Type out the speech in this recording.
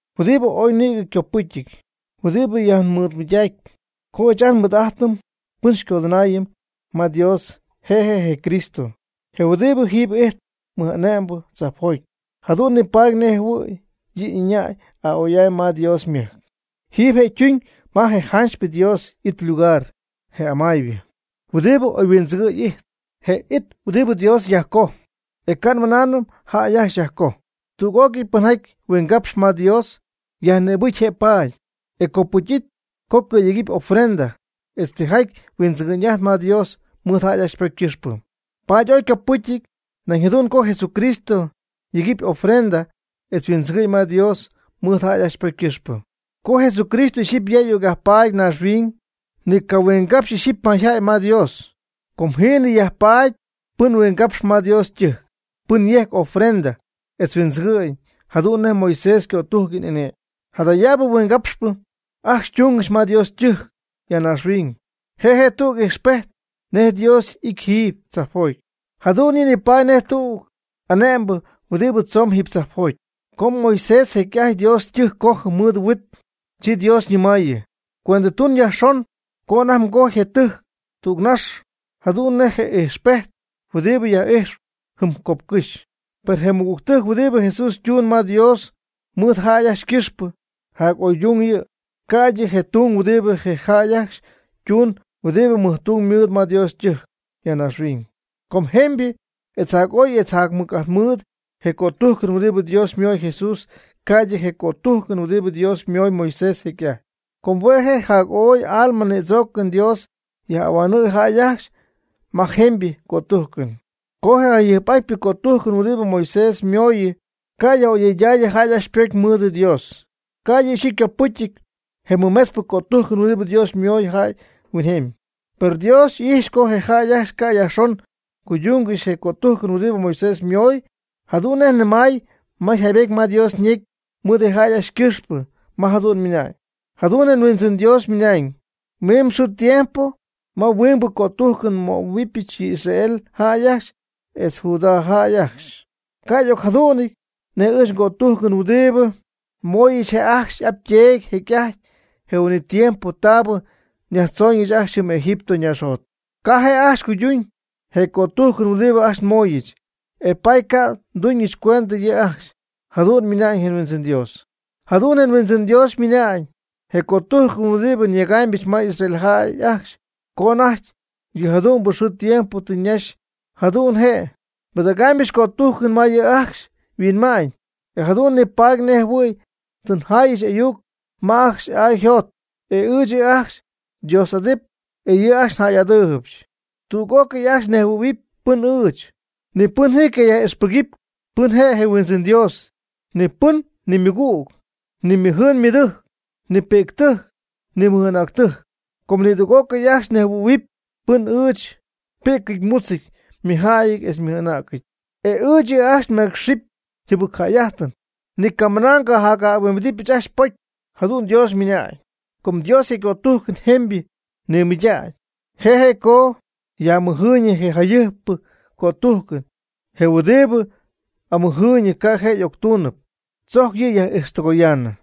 Huɨdibɨ ooy nïgɨ ycopɨcyɨty, huɨdibɨ yajnimɨydaacp, co ɨɨch ajt nmɨɨd'ajtɨm pɨn xycodɨnaayɨm ma Dios, je' je' je Cristo, je huɨdibɨ jiiby ijtp mɨj'ane'mbɨ tzajpjoty, jadu'n nipaady nej jɨhuɨ̈y yɨ' y'ɨñäy a'oy'amy ma Dios ymɨjc. Jiiby je' ytuñ ma je janchypɨ Dios y'it ylugar, je amaaybɨ, huɨdibɨ oyhuindzɨgɨ̈y ijtp. Je it huɨdibɨ Dios yajcoj, e ca' nmɨnaanɨm jäy ajcxy yajcoj. Tüg'ócɨy pɨnjaty huingapxp ma Dios, yajnïbɨcy je' paady, e copɨcyɨty co cɨ̈yegɨpy ofrenda etz tijaty huindzɨgɨ'ñ ma Dios mɨɨd jäy ajcxy ypocy ycɨxpɨ. Paady ooy ycopɨcyɨty nañ jadu'n co Jesucristo yegɨpy ofrenda etz huindzɨgɨ'ñ ma Dios mɨɨd jäy ajcxy ypocy ycɨxpɨ. Co Jesucristo ixyipy ya y'ocyajpaady naaxhuiñ, ni ycahuingapxy ixyipy mayjäy ma Dios. Com jiinɨ ya yajpaady pɨn huingapxɨp ma Dios ytɨjc, pɨn yejcp ofrenda etz huindzɨgɨ'ñ jadu'n nej Moisés ycötujcɨn y'ane'my. Jadayaabɨ huingapxpɨ ajcxy ytungɨxy ma Dios ytɨjc ya naaxhuiñ. Je' je' tüg ijxpejt nej Dios y'it jiiby tzajpjoty, jadu'n yɨ' nipaady nej tüg anecpɨ huɨdibɨ tzomyb jiiby tzajpjoty. Co Moisés jecy'ajty Dios ytɨjc je' cojɨ mɨɨd huit, chi Dios ñɨmaayɨ: “Cuendɨtun yajxon co anajty mgojy je tɨjc tügnax jadu'n nej je ijxpejt huɨdibɨ nyaj'ijx jɨm copcɨ́xy.” Per je mɨjtung huɨdibɨ Jesús ytumyb ma Dios mɨɨd jäy ajcxy ycɨxpɨ, jac'oydung yɨ' ca'ydɨ je tung huɨdibɨ je jäy ajcxy ytumyb huɨdibɨ mɨjtung mɨɨd ma Dios ytɨjc ya naaxhuiñ. Com jemybɨ etz jac'oy etz jacmɨc'ajt mɨɨd je cötujcɨn huɨdibɨ Dios ymoy Jesús, ca'ydɨ je cötujcɨn huɨdibɨ Dios ymoy Moisés jecy'ajt. Com hue' je' jac'oy alma nïdzoocɨn Dios yaj'ahuanɨɨy jäy ajcxy ma je jemybɨ cötujcɨn. Co je jayɨjp'atypɨ cötujcɨn huɨdibɨ Moisés ymooyɨ cayaj'oyɨydaayɨ jäy ajcxy ypocy mɨɨd Dios, ca' yɨ' ixyipy ycopɨcyɨty je mɨmetzpɨ cötujcɨn huɨdibɨ Dios ymoy jäy huinjemy. Per Dios y'ijx co je jäy ajcxy ca' yajxon cuydungɨxy je cötujcɨn huɨdibɨ Moisés ymoy, jadu'n nej ymɨna'ñ ma yjaybetyɨty ma Dios ñecy mɨɨd je' ajcxy ycɨxpɨ, ma jadu'n ymɨna'ñ: Jadu'n je Huindzɨn Dios ymɨna'ñ: “Mimb xɨɨ tiempo ma huingbɨ cötujcɨn nmöhuɨbɨch yɨ Israel jäy etz Judá jäy ajcxy. Ca' y'ocjadu'nɨñ nej ɨɨch ngötujcɨn huɨdibɨ nmooyɨch je' ajcxy y'ap yteedy jecy'ajty, je huin'it tiempo taabɨ nyajtzooñɨch ajcxy jɨm Egipto naaxjot. Ca'p je' ajcxy cuyduñ je cötujcɨn huɨdibɨ ajcxy nmooyɨch, e paady ca' nduuñɨch cuendɨ yɨ' ajcxy.” Jadu'n ymɨna'ñ je Huindzɨn Dios. Jadu'n je Huindzɨn Dios ymɨna'ñ: Je cötujcɨn huɨdibɨ nyegaamybɨch ma Israel jäy ajcxy co anajty yɨjadu'mbɨ xɨɨ tiempo tɨ ñaxy, jadu'n je'. Nbɨdägɨbɨch ngötujcɨn ma yɨ' ajcxy yhuinma'ñ, e jadu'n nipaady nej jɨhuɨ̈y tɨ njayɨch n'ayuc ma ajcxy y'ay yjot. E ɨɨch yɨ' ajcxy xyDios'adɨɨb, e yɨ' ajcxy njäy'adɨɨybɨch. Tüg'ócɨy ajcxy nejhuɨ̈huɨpy pɨn ɨɨch. Ni pɨn ji cayaj'ixpɨgɨpy pɨn je' je Huindzɨn Dios, ni pɨn, ni ymɨgüg, ni ymɨjɨɨn ymɨdɨjc, ni pi'ctɨjc ni mɨj'anäctɨjc. Com nidüg'ócɨy ajcxy nejhuɨ̈huɨpy pɨn ɨɨch; ypi'cɨty ymutzɨty, ymɨjjäyɨty, etz ymɨj'anäcɨty. E ɨɨch yɨ' ajcxy nmeecxɨp yjɨbɨcjäy'ajtɨn, ni camɨna ngajac'ajɨhuɨ̈huɨɨybɨch ajcxy ypocy. Jadu'n Dios ymɨna'ñ. Co Dios je' ycötujcɨn jemybɨ nimɨydägy, je' je' co yaj'amɨjɨɨyñɨ je jayɨjp'atpyɨ cötujcɨn. Je huɨdibɨ amɨjɨɨyñɨp ca' je' y'octuunɨp, tzojc yɨ' yaj'ijxtɨgoyaanɨ.